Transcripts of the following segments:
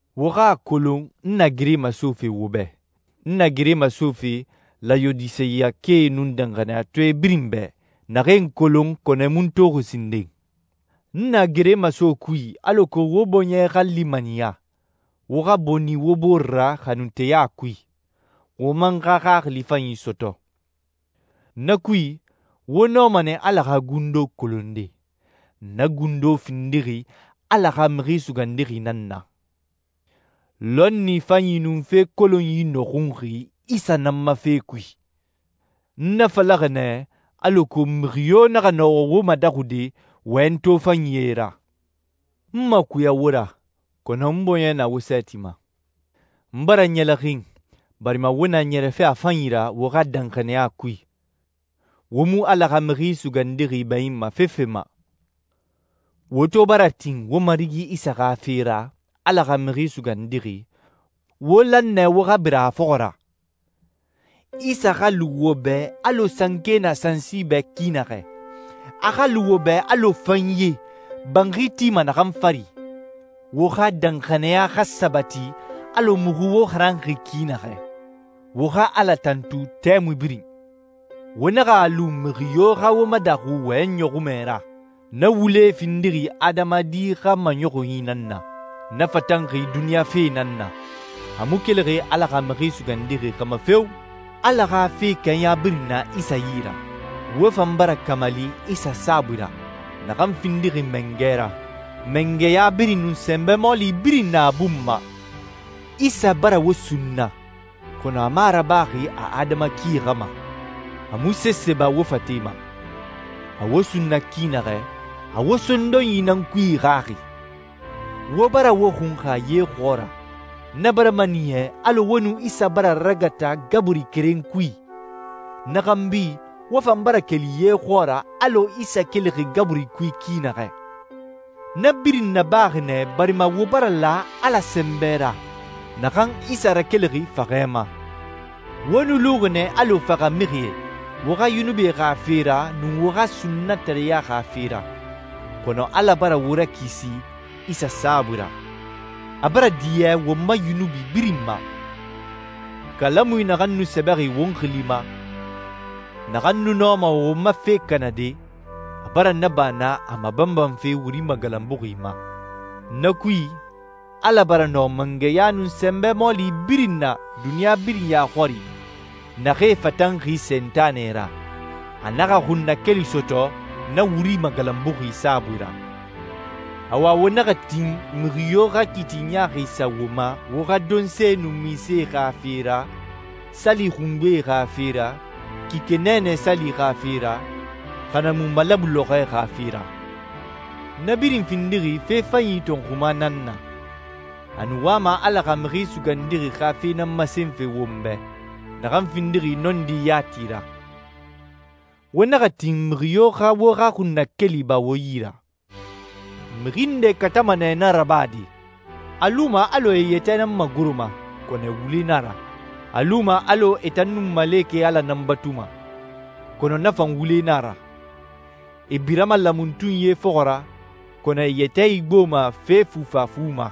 Wo xa a kolon n na gere masofe wo bɛ, n na gere masofe Layodiseyakae nun danxaniyatɔɛ birin bɛ, naxee n kolon kɔnɔ e mu n toxi sinden. N na gere maso kui alako wo bɔɲɛ xa limaniya, wo xa boni wo bore ra xanunteya kui, wo man xa xaxili fanyi sɔtɔ. Na kui, wo nɔma nɛ Ala xa gundo kolonde. Na gundo findixi Ala xa Mixi Sugandixi nan na. Lɔnni fanyi nun fe kolonyi nɔxunxi Isa nan ma fe kui. N na falaxi nɛ, alako mixi yo naxa nɔ wo madaxude wɔyɛnyi tofanyie ra. N makuya wo ra, kɔnɔ n bɔɲɛ na wo sɛɛti ma. N bara ɲɛlɛxin, barima wo na ɲɛrɛfe a fanyi ra wo xa danxaniya kui. Wo mu Ala xa Mixi Sugandixi bɛɲinma fefe ma. Wo to bara tin wo Marigi Isa xa fe ra, Ala xa Mixi Sugandixi, wo lan nɛ wo xa bira a fɔxɔ ra. Isa xa lu wo bɛ alɔ sanke na sansi bɛ ki naxɛ. A xa lu wo bɛ alɔ fanye, banxi tima naxan fari. Wo xa danxaniya xa sabati alɔ muxu wo xaranxi ki naxɛ. Wo xa Ala tantu tɛmui birin. Wo naxa a lu mixi yo xa wo madaxu wɔyɛnyi ɲɔxunmɛ ra. Na wulee findixi adamadi xa maɲɔxunyi nan na. Na fatanxi duniɲa fe nan na. A mu kelixi Ala xa Mixi Sugandixi xa ma feo! Ala xa fe kɛɲa birin na Isa yi ra. Wo fan bara kamali Isa saabui ra, naxan findixi mangɛ ra. Mangɛya birin nun sɛnbɛ mɔɔli birin na a bun ma. Isa bara wo sunna, kɔnɔ a mu a rabaxi a adama ki xa ma. A mu sese ba wo fate ma. A wo sunna ki naxɛ, a wo sondonyi nan kui ixaxi. Wo bara wo xunxa ye xɔɔra. Na bara maniya alɔ wo nun Isa bara ragata gaburi keren kui. Na xanbi wo fan bara keli ye xɔɔra alɔ Isa kelixi gaburi kui ki naxɛ. Na birin nabaxi nɛ barima wo bara la Ala sɛnbɛ ra, naxan Isa rakelixi faxɛ ma. Wo nu luxi nɛ alɔ faxamixie, wo xa yunubie xa fe ra nun wo xa sunnatareya xa fe ra, kɔnɔ Ala bara wo rakisi Isa saabui ra. A bara diɲɛ won ma yunubi birin ma. Kalamui naxan nu sɛbɛxi won xili ma, naxan nu nɔma won ma fe kanade, a bara na ba na a mabanbanfe wuri magalanbuxi ma. Na kui, Ala bara nɔ mangɛya nun sɛnbɛ mɔɔli birin na duniɲa birin ya xɔri, naxee fatanxi Sentanɛ ra, a naxa xunnakeli sɔtɔ na wuri magalanbuxi saabui ra. Awa, wo naxa tin mixi yo xa kiiti ɲaaxi sa wo ma wo xa donse nun minse xa fe ra, sali xungbee xa fe ra, kike nɛɛnɛ sali xa fe ra, xa na mu malabu lɔxɔɛ xa fe ra. Na birin findixi fe fanyi tɔnxuma nan na. A nu wama Ala xa Mixi Sugandixi xa fe nan masenfe won bɛ, naxan findixi nɔndi yati ra. Wo naxa tin mixi yo xa wo xa xunnakeli ba wo yi ra. Mixi ndee katama nɛ na rabade. A luma alɔ e e yɛtɛ nan magoroma, kɔnɔ wule na a ra. A luma alɔ e tan nun malekɛe Ala nan batuma, kɔnɔ na fan wule nan a ra. E birama laamatunyie fɔxɔ ra, kɔnɔ e e yɛtɛ igboma fe fufafu ma.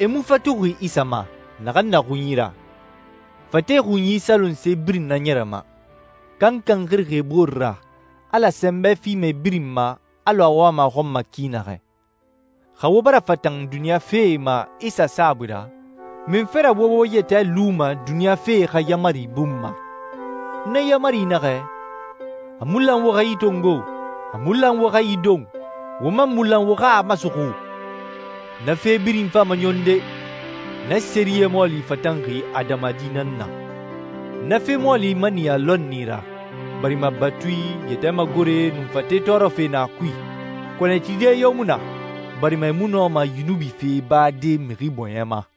E mu fatuxi Isa ma, naxan na xunyi ra. Fate xunyi salonse birin naɲɛrɛma. Kankan xirixi e boore ra, Ala sɛnbɛ fima e birin ma alɔ a wama a xɔn ma ki naxɛ. Xa wo bara fatan duniɲa fee ma Isa saabui ra, munfe ra wo wo yɛtɛ luma duniɲa fee xa yaamari bun ma? Na yaamari naxɛ, «A mu lan wo xa yi tongo! A mu lan wo xa yi don! Wo man mu lan wo xa a masuxu!» Na fe birin fama ɲɔnde. Na sɛriyɛ mɔɔli fatanxi adamadi nan na. Na fe mɔɔli maniya lɔnni ra, barima batui, yɛtɛ magore, nun fate tɔɔrɔfe na a kui, kɔnɔ e tide yo mu na, barima e mu nɔma yunubi fee bade mixi bɔɲɛ ma.